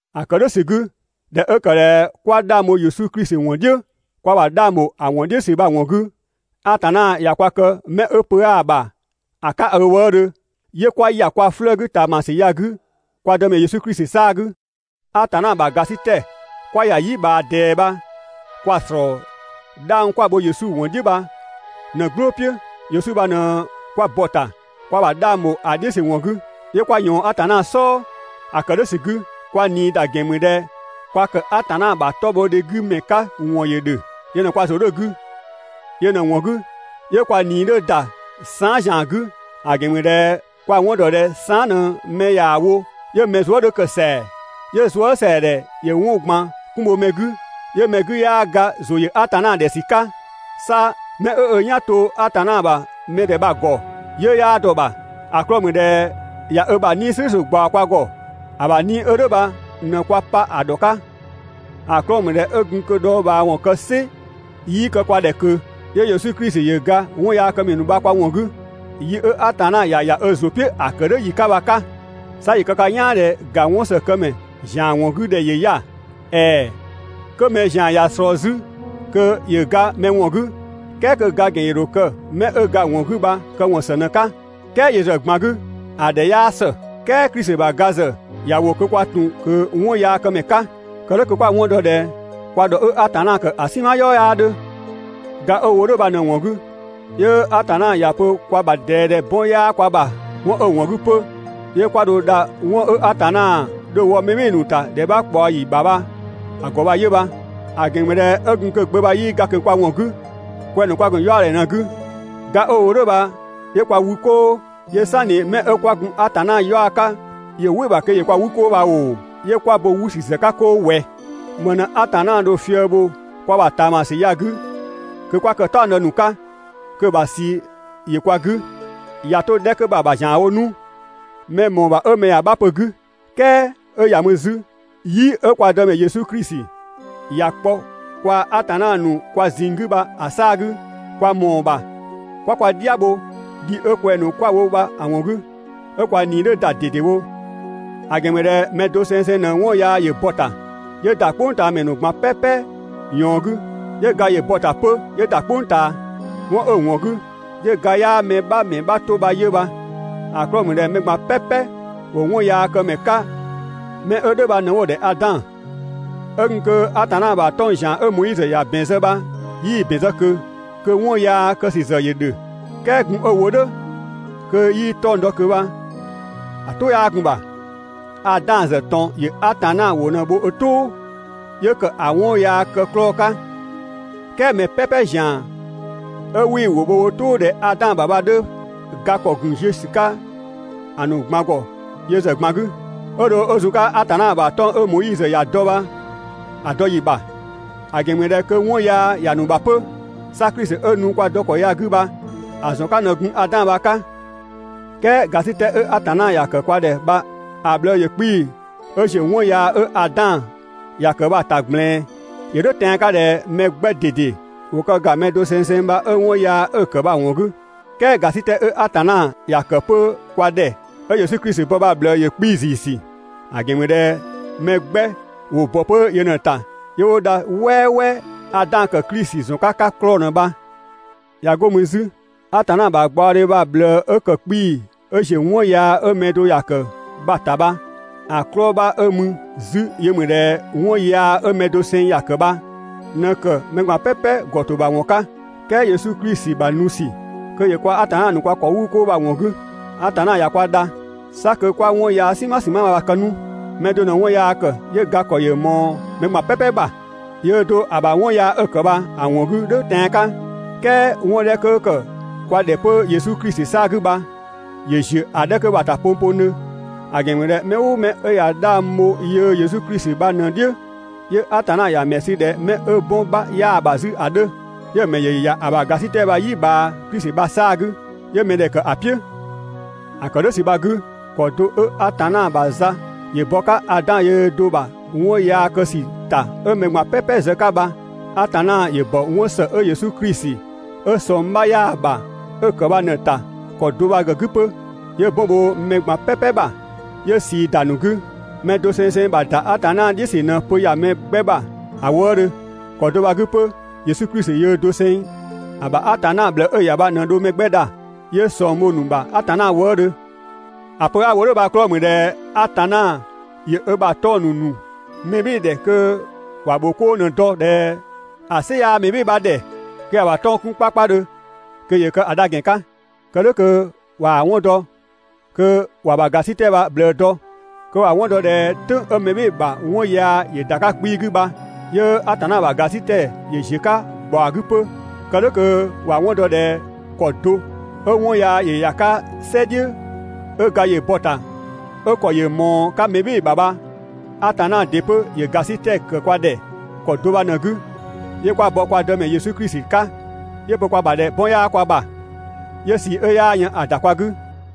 ‑A ‑kë "dhʋ̈ ‑sü 'gü, ꞊dhɛ 'ö ‑kë ꞊dhɛ 'kwa 'dhang bho Yesu Klisi ‑wɔn "dhiʋ̈, kwa ‑bha 'dhang ‑bho ‑a ‑wɔn "dhiʋ̈ ‑sü bha‑ ‑wɔn 'gü, Atanna ꞊ya kwa kë 'mɛ 'ö pö 'aa‑ ‑bha ‑a 'ka ö wëëdhö, 'yö 'kwa ‑ya kwa 'flëë‑ 'gü ꞊taamasü ya‑ 'gü kwa Dëmɛ Yesu Klisi 'saa‑ 'gü. Atanna ‑bha ‑gasitɛ 'kwa ‑ya ‑a "yi ꞊bhaa ꞊dɛɛ bha kwa‑ ‑slɔɔ 'dhang 'kwa‑ bho Yesu ‑wɔn "dhiʋ̈ bha ꞊në‑ "gblʋ̈ "piʋ̈, Yesu bha ꞊në 'kwa bɔ‑ ‑ta, kwa ‑bha 'dhang ‑bho ‑a "dhiʋ̈ ‑sü ‑wɔn 'gü, 'yö 'kwa ꞊yɔɔn Atanna "sɔɔ. ‑A ‑kë "dhʋ̈ ‑sü 'gü, kwa ꞊nii ‑da ‑gɛn ‑mü ꞊dhɛ kwa ‑kë Atanna ‑bha 'tɔbhɔdhe 'gü ‑mɛ 'ka ‑wɔn ‑yö ‑dhö. Yö ꞊në kwa ‑zʋ 'dhö‑ 'gü Yö ꞊në‑ ‑wɔn 'gü, 'yö kwa ꞊nii 'dhö ‑da saan" ‑zian 'gü, ‑a ‑gɛn ‑mü ꞊dhɛ kwa‑ 'wɔn ‑dɔ ꞊dhɛ saan" ꞊në mɛ ꞊yaa‑ wo 'yö mɛ zuë" 'dhö ‑kë ‑sɛa, 'yö zuësɛadhɛ ‑yö 'wɔn ꞊gban 'kun bho mɛ 'gü, 'yö mɛ 'gü 'yaa ga ‑zʋ ‑yö Atanna ‑dhɛ ‑sü 'ka. 'Sa 'mɛ 'ö ö "yan to Atanna ‑bha mɛ ‑dhɛ bha‑ ‑gɔ, 'yiʋ̈‑ 'yaa dɔ‑ ‑bha. ‑A 'klɔɔ‑ ‑mü ꞊dhɛ ꞊ya ö ‑bha 'Nii‑ "slʋ̈ʋ̈slʋ̈ ꞊gbaɔ kwa ‑gɔ. ‑A ‑bha 'Nii‑ 'ö "dhʋ̈ bha ꞊në kwa pa ‑a ‑dhɔ 'ka. ‑A 'klɔɔ‑ ‑mü ꞊dhɛ 'ö gun kö‑ dhɔɔbhaawɔn kë "sɩ 'yii kë kwa ‑dhɛ ꞊kö, 'yö Yesu Klisi ‑yö ga 'wɔnyaakëmɛ ‑nu bha kwa ‑wɔn 'gü, yi 'ö Atanna ‑ya ‑ya ö ‑zʋ "piʋ̈ ‑a ‑kë "dhʋ̈ ‑yi 'ka bha‑ 'ka. 'Sa ‑yö kë ka "yaan ꞊dhɛ ‑ga 'wɔnsëkëmɛ ‑zian ‑wɔn 'gü ‑dhɛ ‑yö 'ya‑. ‑Ɛɛ, 'kö mɛ ‑zian ꞊ya ꞊slɔɔ 'zü kö ‑yö ga mɛ ‑wɔn 'gü, "kɛɛ kö‑ ga ‑gɛn ‑yö ‑dho kë 'mɛ 'ö ga‑ ‑wɔn 'gü bha‑ këwɔn ‑së ꞊në‑ 'ka. "Kɛɛ yö ‑zë ꞊gban 'gü ‑a ‑dhɛ 'yaa ‑së. "Kɛɛ Klisi ‑bha ga ‑zë ‑ya ‑wo kö kwa ‑tun kö 'wɔnyaakëmɛ 'ka. Kë "dhʋ̈ kö 'kwa‑ 'wɔn dɔ ꞊dhɛ kwa ‑dhɔ 'ö Atanna ‑kë ‑a "sinma "yɔɔ 'yaa 'dhö. Ga 'ö‑ wo "dhʋ̈ bha ꞊në‑ ‑wɔn 'gü, 'yö Atanna ‑ya pö kwa ‑bha ꞊dɛɛ ꞊dhɛ 'bɔn 'yaa kwa ‑bha. 'Wɔn 'ö‑ ‑wɔn 'gü 'pö 'yö 'kwa dho dha 'wɔn 'ö Atanna dho‑ wɔ mɛ "bhɩɩ‑ ‑nu ‑ta ‑dhɛ 'bha ꞊kpaɔ ‑yi ‑bha bha‑ ‑gɔ bha 'yö bha. ‑A ‑gɛn ‑mü ꞊dhɛ 'ö gun kö‑ Gbö bha 'yii ga ꞊kö kwa ‑wɔn 'gü, kwɛng‑ ‑nu kwa ‑gun 'yaɔdhɛ ꞊në‑ 'gü. Ga 'ö‑ wo "dhʋ̈ bha 'yö kwa wü 'koo. 'Yö "sanni 'mɛ 'ö 'kwa gun Atanna 'yaɔ‑ 'ka ‑yö "wɩ‑ ‑bha kö ‑yö kwa 'wü 'koo bha ‑oo, 'yö 'kwa bo 'wü ‑sü ‑zë 'ka 'koo ꞊wɛ? ‑Më ꞊në Atanna dho‑ fië‑ bho kwa ‑bha ꞊taamasü ya‑ 'gü kö 'kwa kë‑ "taɔngdë ‑nu 'ka, kö‑ ‑bha ꞊sii ‑yö kwa 'gü. ꞊Ya 'to‑ 'dhɛ 'kö bha‑ ‑bha ‑zianwo 'nu, mɛ‑ ‑mɔɔ ‑bha 'ö mɛ ‑ya 'bha pö‑ 'gü, "kɛɛ 'ö ‑ya mü 'zü, "yi 'ö kwa Dëmɛ Yesu Klisi ‑ya kpɔ kwaa‑ Atanna ‑nu kwa ꞊zinng 'gü bha‑ 'saa‑ 'gü, kwa ‑mɔɔ ‑bha 'kwa kwa "dhia bho, dhi 'ö kwɛng‑ ‑nu 'kwa‑ wo bha‑ ‑wɔn 'gü, 'ö kwa ꞊nii 'dhö ‑da ꞊dedewo. ‑A ‑gɛn ‑mü ꞊dhɛ mɛ doseng ꞊në 'wɔn yaa ‑yö bɔ‑ ‑ta 'yö ‑da "kpʋngtaamɛ ꞊gban "pɛpɛ ꞊yɔɔn 'gü, 'yö ga ‑yö bɔ‑ ‑ta 'pö 'yö ‑da "kpʋng ꞊taa. 'Wɔn 'ö‑ ‑wɔn 'gü 'yö ga 'yaa mɛ 'bha ‑mɛ 'bha 'to bha 'yö bha. ‑A 'klɔɔ‑ ‑mü ꞊dhɛ mɛ ꞊gban "pɛpɛ ‑wo 'wɔnyaakëmɛ 'ka 'mɛ bha ꞊në 'wo‑ ‑dhɛ Adan. 'Ö gun kö Atanna ‑bha 'tɔng‑ ‑zian 'ö Moizö ‑ya ‑bɛn zë bha 'yii‑ ‑bɛn zë ꞊kö, kö 'wɔn yaa kë ‑sü ‑zë ‑yö ‑dhö. "Kɛɛ gun 'ö‑ wo "dhʋ̈ kö 'yii 'tɔng‑ dɔ ꞊kö bha‑ "tʋ 'yaa gun‑ ‑bha. Adan ‑zë ꞊tɔn ‑yö Atanna ‑wʋ ꞊në bho ö "tʋʋ, 'yö ‑kë ‑a 'wɔn yaa kë 'klɔɔ‑ 'ka, "kɛɛ mɛ "pɛpɛ ‑zian 'ö 'wii‑ ‑wʋ bho wo "tʋʋ ꞊dhɛ Adan ‑bha bha‑ 'dhö, ga ‑kɔ ‑gun ziö ‑sü 'ka‑ ‑nu ꞊gban ‑gɔ yö ‑zë ꞊gban 'gü, 'ö dho 'ö zun‑ 'ka Atanna ‑bha 'tɔng‑ 'ö Moizö ‑ya dɔ bha‑ dɔ ‑yi ‑bha, ‑a ‑gɛn ‑mü ꞊dhɛ kö 'wɔn yaa ‑ya ‑nu ‑bha 'pö, 'sa Klisi 'ö nu kwa dɔ ‑kɔ ya‑ 'gü bha‑ ‑zɔn 'ka ꞊në gun Adan bha‑ 'ka. "Kɛɛ ‑gasitɛ 'ö Atanna ‑ya ‑kë kwa ‑dhɛ bha‑ ꞊bhlëë ‑yö 'kpii‑ 'ö ‑ziö 'wɔn yaa 'ö Adan ‑ya ‑kë bha‑ ‑ta ꞊gblɛɛn. ‑Yö "dhʋ̈ tɛan‑ 'ka ꞊dhɛ mɛ 'gbɛ ꞊dede ‑wo kë ‑ga mɛ dosengseng bha 'ö 'wɔn yaa 'ö‑ ‑kë bha‑ ‑wɔn 'gü, "kɛɛ ‑gasitɛ 'ö Atanna ‑ya ‑kë 'pö kwa ‑dhɛ 'ö Yesu Klisi bɔ bha‑ ꞊bhlëë ‑yö 'kpii‑ ‑ziisü, ‑a ‑gɛn ‑mü ꞊dhɛ mɛ 'gbɛ ‑wo ‑bɔ 'pö yö ꞊në‑ ‑ta 'yö 'wo dha "wɛɛwɛɛ (Adan ‑kë Klisi ‑zɔn 'ka 'ka 'klɔɔ‑ ꞊në bha). ꞊Ya 'go mü 'zü, Atanna ‑bha gbaɔdhe bha‑ ꞊bhlëë 'ö ‑kë 'kpiisü 'ö ‑ziö 'wɔn yaa 'ö mɛ do ‑ya kë bha‑ ‑ta bha, ‑a 'klɔɔ‑ 'bha 'ö mü 'zü yö ‑mü ꞊dhɛ 'wɔn yaa 'ö mɛ doseng ‑ya ‑kë bha ꞊në ‑kë mɛ ꞊gban "pɛpɛ ‑gɔ ‑to ‑bha ‑wɔn 'ka, "kɛɛ Yesu Klisi ‑bha nu ‑sü kö ‑yö kwaa‑ Atanna ‑nu kwa ‑kɔ 'wü 'koo bha‑ ‑wɔn 'gü, Atanna ꞊ya kwa dha, 'sa kö 'kwa 'wɔn yaa "sinma ‑sinma bha‑ kë 'nu. Mɛ do ꞊në 'wɔn yaa ‑kë 'yö ga ‑kɔ ‑yö ꞊mɔɔ mɛ ꞊gban "pɛpɛ ‑bha, yöö do ‑a ‑bha 'wɔn yaa 'ö‑ ‑kë bha‑ ‑wɔn 'gü "dhʋ̈ tɛan‑ 'ka, "kɛɛ 'wɔn 'dhɛ 'kö ‑kë kwa ‑dhɛ 'pö Yesu Klisi 'saa‑ 'gü bha ‑yö ‑ziö ‑a 'dhɛ 'kö bha‑ ‑ta pongpongdhö. ‑A ‑gɛn ‑mü ꞊dhɛ mɛ "ʋʋ mɛ 'ö ꞊ya 'dhang bho yöö Yesu Klisi bha ꞊në‑ "dhiʋ̈, 'yö Atanna ‑ya ‑mɛ sü ꞊dhɛ 'mɛ 'ö 'bɔn 'bha 'yaa‑ ‑bha 'zü ‑a 'dhö. 'Yö‑ ‑mɛ ‑yö ‑ya ‑a ‑bha ‑gasitɛ bha‑ "yi ꞊bhaa Klisi bha‑ 'saa‑ 'gü, 'yö mɛdhɛ ‑kë ‑a "piʋ̈. ‑A ‑kë "dhʋ̈ ‑sü bha‑ 'gü, ‑kɔ do 'ö Atanna ‑bha za ‑yö bɔ‑ 'ka Adan yöö do‑ ‑bha 'wɔn yaa kë ‑sü ‑ta 'ö mɛ ꞊gban "pɛpɛ zë‑ 'ka bha, Atanna ‑yö ‑bɔ 'wɔn ‑së 'ö Yesu Klisi 'ö ꞊sɔng 'bha 'yaa‑ ‑bha 'ö‑ ‑kë bha ꞊në‑ ‑ta ‑kɔ do bha‑ 'gü 'pö, 'yö 'bɔn bho‑ 'ka mɛ ꞊gban "pɛpɛ ‑bha, 'yö ꞊sii ‑da ‑a ‑nu 'gü. Mɛ dosengseng ‑bha ‑da Atanna "dhiʋ̈ ‑sü ꞊në pö ‑ya mɛ 'gbɛ ‑bha ‑a wëëdhö. ‑Kɔ do bha‑ 'gü 'pö Yesu Klisi yöö doseng ‑a ‑bha Atanna ꞊bhlëë 'ö‑ ‑ya bha ꞊në dho mɛ 'gbɛ dha, 'yö ꞊sɔng bho‑ ‑nu ‑bha Atanna wëëdhö. ‑A pö 'a‑ wo "dhʋ̈ bha‑ 'klɔɔ‑ ‑mü ꞊dhɛ Atanna ‑yö ö ‑bha 'tɔng‑ ‑nu ‑nu mɛ "bhɩɩ‑ ‑dhɛ kö ‑wa ‑bho 'koo ꞊në dɔ ꞊dhɛ ‑a "sɩ 'yaa mɛ "bhɩɩ‑ bha ‑dhɛ kö ‑ya ‑bha 'tɔng‑ 'kun 'kpakpadhö kö ‑yö kë ‑a dha ‑gɛn 'ka. Kë "dhʋ̈ kö ꞊waa‑ 'wɔn dɔ, kö ‑wa ‑bha ‑gasitɛ bha‑ ꞊bhlëë dɔ, kö ‑wa 'wɔn dɔ ꞊dhɛ "tʋ̈ng 'ö mɛ "bhɩɩ‑ ‑bha 'wɔn yaa ‑yö ‑da 'ka 'kpii‑ 'gü bha, 'yö Atanna ‑bha ‑gasitɛ ‑yö ‑ziö 'ka ‑gbaɔ 'gü 'pö. Kë "dhʋ̈ kö ‑wa 'wɔn dɔ ꞊dhɛ ‑kɔ do 'ö 'wɔn yaa ‑yö ‑ya 'ka "sɛ "dhiʋ̈ 'ö ga ‑yö bɔ‑ ‑ta 'ö‑ ‑kɔ ‑yö ꞊mɔɔ‑ 'ka mɛ "bhɩɩ‑ ‑bha bha, Atanna ‑dɩ 'pö ‑yö ‑gasitɛ ‑kë kwa ‑dhɛ ‑kɔ do bha ꞊në‑ 'gü, 'yö 'kwa bɔ kwa Dëmɛ Yesu Klisi 'ka, 'yö‑ pö kwa ‑bha ꞊dhɛ 'bɔn 'yaa kwa ‑bha, 'yö ꞊sii 'ö 'yaa yën ‑a ‑da kwa 'gü.